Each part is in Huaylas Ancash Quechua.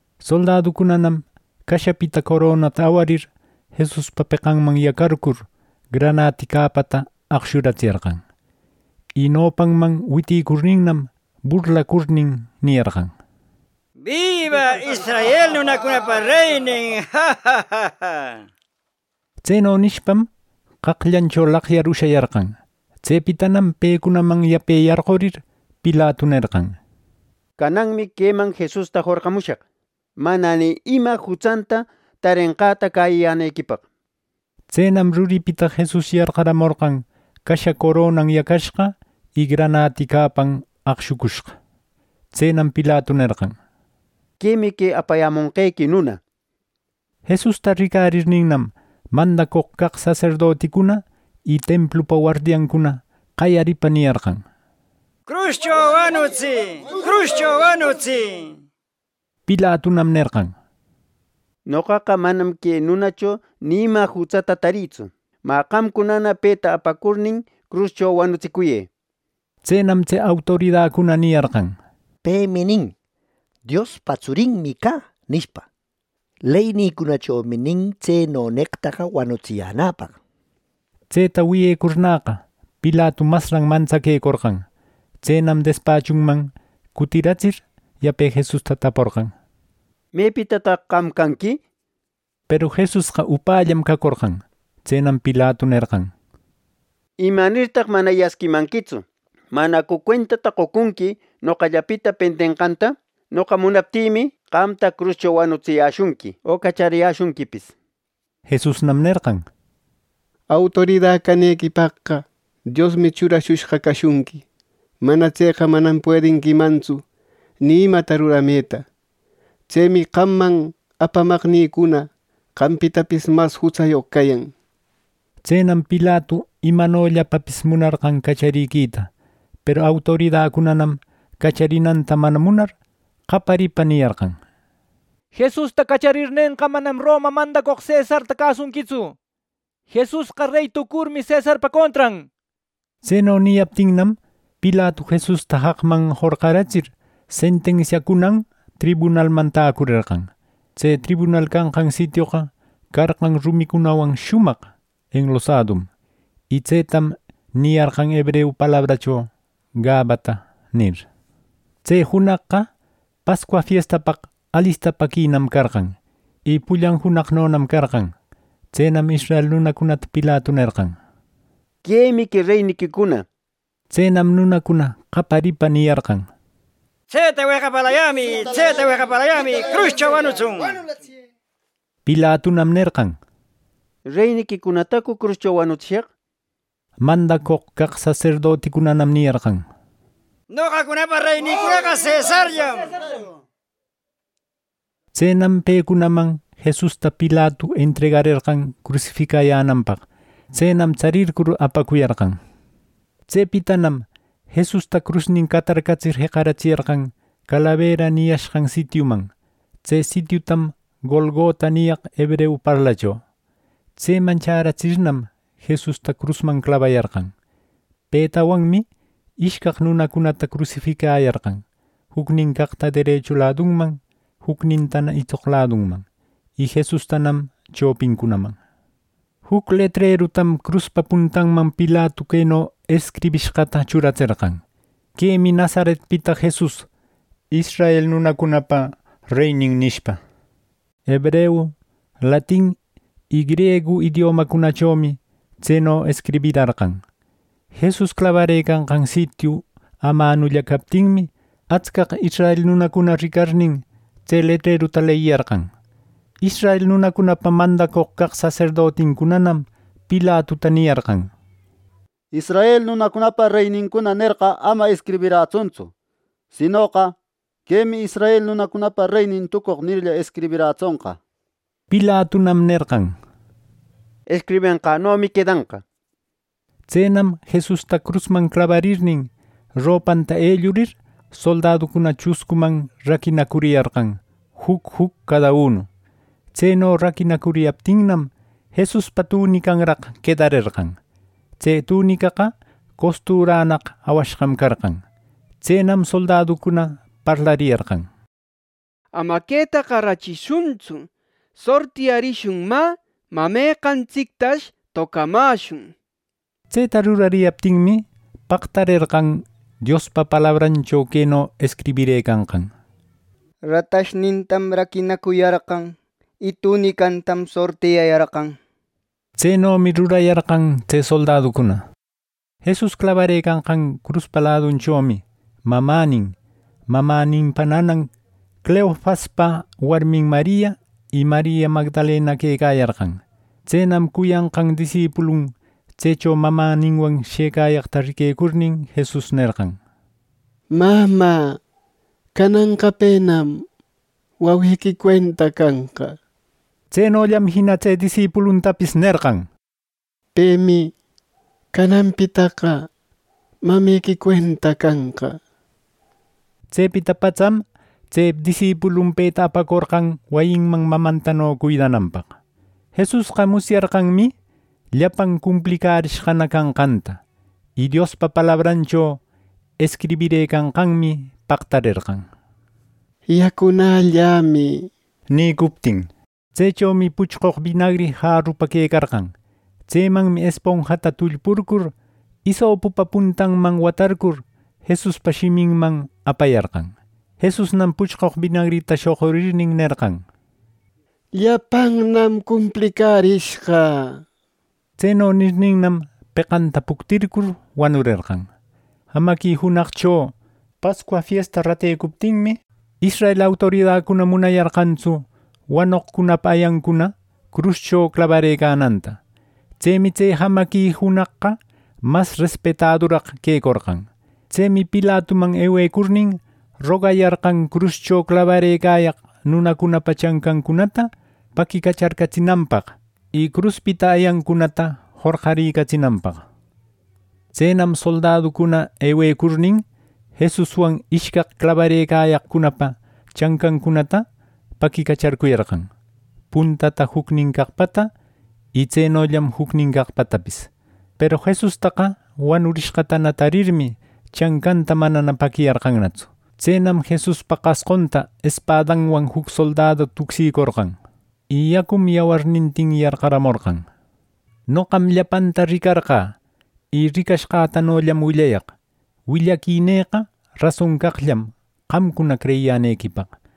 Soldaducunanam cashapita coronata awarir, Jesuspa peqanman yacarcur, granati capata aqshuratsiyarqan. Y nopanman witicurninnam, burlacurnin niyarqan: —¡Biba, israel nunacunapa reynin! —nir. Tseno nishpam qaqllancho laqyar ushayarqan. Tsepitanam pecunaman yape yarqurir, Pilatu nerqan: —Cananmi queman Jesusta jorqamushaq mana ni ima jutsanta tarenqäta cäyiyänequipaq. Tsenam ruripita Jesus yarqaramorqan casha coronan yacashqa y granati capan aqshucushqa. Tsenam Pilatu nerqan: —Quemi que apayämonqequi nuna —nir. Jesusta ricarirninnam, mandacoq caq saserdoticuna y templupa wardiancuna qayaripa niyarqan: —¡Cruscho wanutsï! ¡Cruscho wanutsï! —nir. Pilatunam nerqan: —Noqaqa manam que nunacho ni ima jutsata tarïtsu. Mä qamcunana peta apacurnin, cruscho wanutsicuyë —nir. Tsenam tse autoridacuna niyarqan: —Pemi nin, ‘Diospa tsurinmi cä’ nishpa. Leynïcunachomi nin tseno neqtaqa wanutsiyänapaq —nir. Tseta wiyecurnäqa, Pilatu masran mantsaquecorqan. Tsenam despachunman cutiratsir yape Jesusta taporqan: —¿Mepitataq qam canqui? —nir. Peru Jesusqa upällam cacorqan. Tsenam Pilatu nerqan: —¿Imanirtaq mana yasquimanquitsu? ¿Manacu cuentata qocunqui noqallapita pendenqanta? Noqa munaptïmi, qamta cruscho wanutsiyäshunqui o cachariyäshunquipis —nir. Jesusnam nerqan: —Autorida canequipaqqa Diosmi churashushqa cashunqui. Mana tseqa manam puedinquimantsu ni imata rurameta. Tsemi qamman apamaqnïcuna qampitapis mas jutsayoq cayan —nir. Tsenam Pilatu imanollapapis munarqan cachariquita. Peru autoridacunanam cacharinanta mana munar, qaparipa niyarqan: —Jesusta cacharirnenqa, manam Roma mandacoq cesarta cäsunquitsu. Jesusqa rey tucurmi, cesarpa contran —nir. Tseno niyaptinnam Pilatu Jesusta jaqman jorqaratsir, sentensiancunan tribunalman täcurerqan. Tse tribunal canqan sitioqa carqan rumicunawan shumaq enlosadum y tsetam niyarqan hebreu parlacho “Gabata” nir. Tse junaqqa Pascua fiestapaq alistapäquinam carqan. Y pullan junaqnonam carqan. Tsenam israel nunacunata Pilatu nerqan: —Quemi que reyniquicuna. Tsenam nunacuna qaparipa niyarqan: —¡Tseta weqapalayämi! ¡Tseta weqapalayämi! ¡Cruscho wanutsun! —nir. Pilatunam nerqan: —¿Reyniquicunatacu cruscho wanutsishaq! —nir. Mandacoq caq saserdoticunanam niyarqan: —Noqacunapa reynïcunaqa cesarllam —nir. Tsenam pecunaman Jesusta Pilatu entregarerqan crusificayänanpaq. Tsenam tsarircur apacuyarqan. Tsepitanam Jesusta crusnin catarcatsir, jeqaratsiyarqan calabera niyashqan sitiuman. Tse sitiutam “Golgota” niyaq hebreu parlacho. Tseman chäratsirnam, Jesusta crusman clabayarqan. Petawanmi ishcaq nunacunata crusificayarqan jucnin caqta derechu ladunman jucnintana itsoq laduman y Jesustanam chopincunaman. Juc letrerutam cruspa puntanman Pilatu queno escribishqata churatserqan: “Quemi Nazaretpita Jesus, israel nunacunapa reynin” nishpa. Hebreu, latin y griegu idiomacunachomi tseno escribirarqan. Jesus clabarëcanqan sitiu amanulla captinmi, atscaq israel nunacuna ricarnin, tse letreruta leyiyarqan. Israel nunacunapa mandacoq caq saserdoticunanam Pilatuta niyarqan: —‘Israel nunacunapa reynincuna’ nerqa ama escribirätsuntsu. Sinoqa, ‘Quemi israel nunacunapa reynin tucoq’ nirlla, escribirätsonqa —nir. Pilatunam nerqan: —Escribenqänomi quedanqa —nir. Tsenam Jesusta crusman clabarirnin, ropanta ellurir soldaducuna chuscuman raquinacuriyarqan juc juc cada unu. Tseno raquinacuriyaptinnam, Jesuspa tunicanraq quedarerqan. Tse tunicaqa costurannaq awashqam carqan. Tsenam soldaducuna parlariyarqan: —¡Ama quetaqa rachishuntsu! ¡Sortiyarishun! Mä, ¿meqantsictash tocamäshun? —nishpa. Tseta rurariyaptinmi, pactarerqan Diospa palabrancho queno escribirëcanqan: “Ratashnïtam raquinacuyarqan. Y tunicätam sortiyayarqan” nenqan. Tsenomi rurayarqan tse soldaducuna. Jesus clabarëcanqan cruspa ladunchomi mamänin, mamäninpa nanam, Cleofaspa warmin Maria y Maria Magdalena quecayarqan. Tsenam cuyanqan disipulun tsecho mamäninwan shëcayaqta riquecurnin, Jesus nerqan: —Mamä, cananqa penam wawequi cuenta canqa —nir. Tsenollam jina tse disipuluntapis nerqan: —Pemi canapitaqa mamequi cuenta canqa —nir. Tsepita patsam tse disipulun peta apacorqan wayinman mamantano cuidananpaq. Jesusqa musyarqanmi llapan cumplicärishqana canqanta. Y Diospa palabrancho escribirëcanqanmi pactarerqan “¡Yacunällämi!” nicuptin. Tsechomi puchqoq binagri jarupa quecarqan. Tsemanmi esponjata tullpurcur, isopupa puntanman watarcur, Jesuspa shiminman apayarqan. Jesusnam puchqoq binagrita shoqurirnin nerqan: —Llapannam cumplicärishqa —nir. Tseno nirninnam, peqanta puctircur wanurerqan. Jamaqui junaqcho Pascua fiesta ratecuptinmi, israel autoridacuna munayarqantsu wanoqcunapa ayancuna cruscho clabarëcananta. (Tsemi tse jamaqui junaqqa mas respetaduraq quecorqan.) Tsemi Pilatuman ewecurnin, rogayarqan cruscho clabarëcayaq nunacunapa chancancunata paquicacharcatsinanpaq y cruspita ayancunata jorqaricatsinanpaq. Tsenam soldaducuna ewecurnin, Jesuswan ishcaq clabarëcaqcunapa chancancunata paquicacharcuyarqan, puntata jucnin caqpata y tsenollam jucnin caqpatapis. Peru Jesustaqa wanurishqatana tarirmi, chancanta manana paquiyarqannatsu. Tsenam Jesuspa qasqunta espadanwan juc soldadu tucsicorqan. Y yacum yawarnintin yarqaramorqan. Noqam llapanta ricarqä. Y ricashqätanollam willayaq willaquinïqa rason caqllam qamcuna creyiyänequipaq.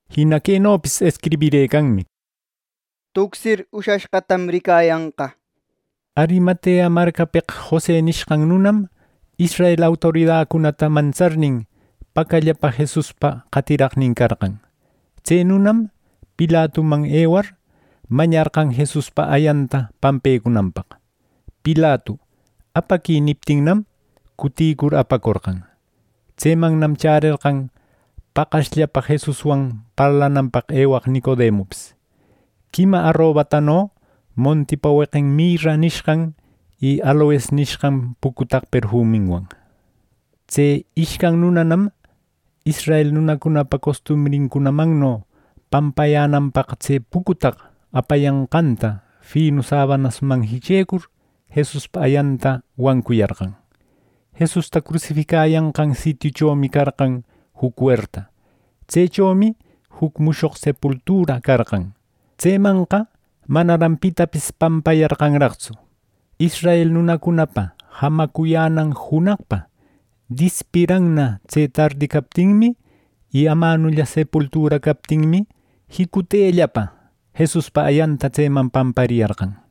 Jina quenopis escribirëcanmi: “Tucsir ushashqatam ricayanqa” nir. Arimatea marcapeq Jose nishqan nunam israel autoridacunata mantsarnin, pacallapa Jesuspa qatiraqnin carqan. Tse nunam Pilatuman ewar, mañarqan Jesuspa ayanta pampecunanpaq. Pilatu “Apaquï” niptinnam, cuticur apacorqan. Tsemannam chärerqan paqasllapa Jesuswan parlananpaq ewaq Nicodemupis, quima arobatano montipa weqin mirra nishqan y aloes nishqan pucutaq perfuminwan. Tse ishcan nunanam israel nunacunapa costumbrincunamanno pampayänanpaq tse pucutaq apayanqanta finu sabanasman jichecur, Jesuspa ayanta wancuyarqan. Jesusta crusificayanqan sitiuchomi carqan juc werta. Tsechomi juc mushoq sepultura carqan. Tsemanqa manaran pitapis pampayarqanraqtsu. Israel nunacunapa jamacuyänan junaqpa dispiranna tse tardi captinmi, y amanulla sepultura captinmi, jicutellapa Jesuspa ayanta tseman pampariyarqan.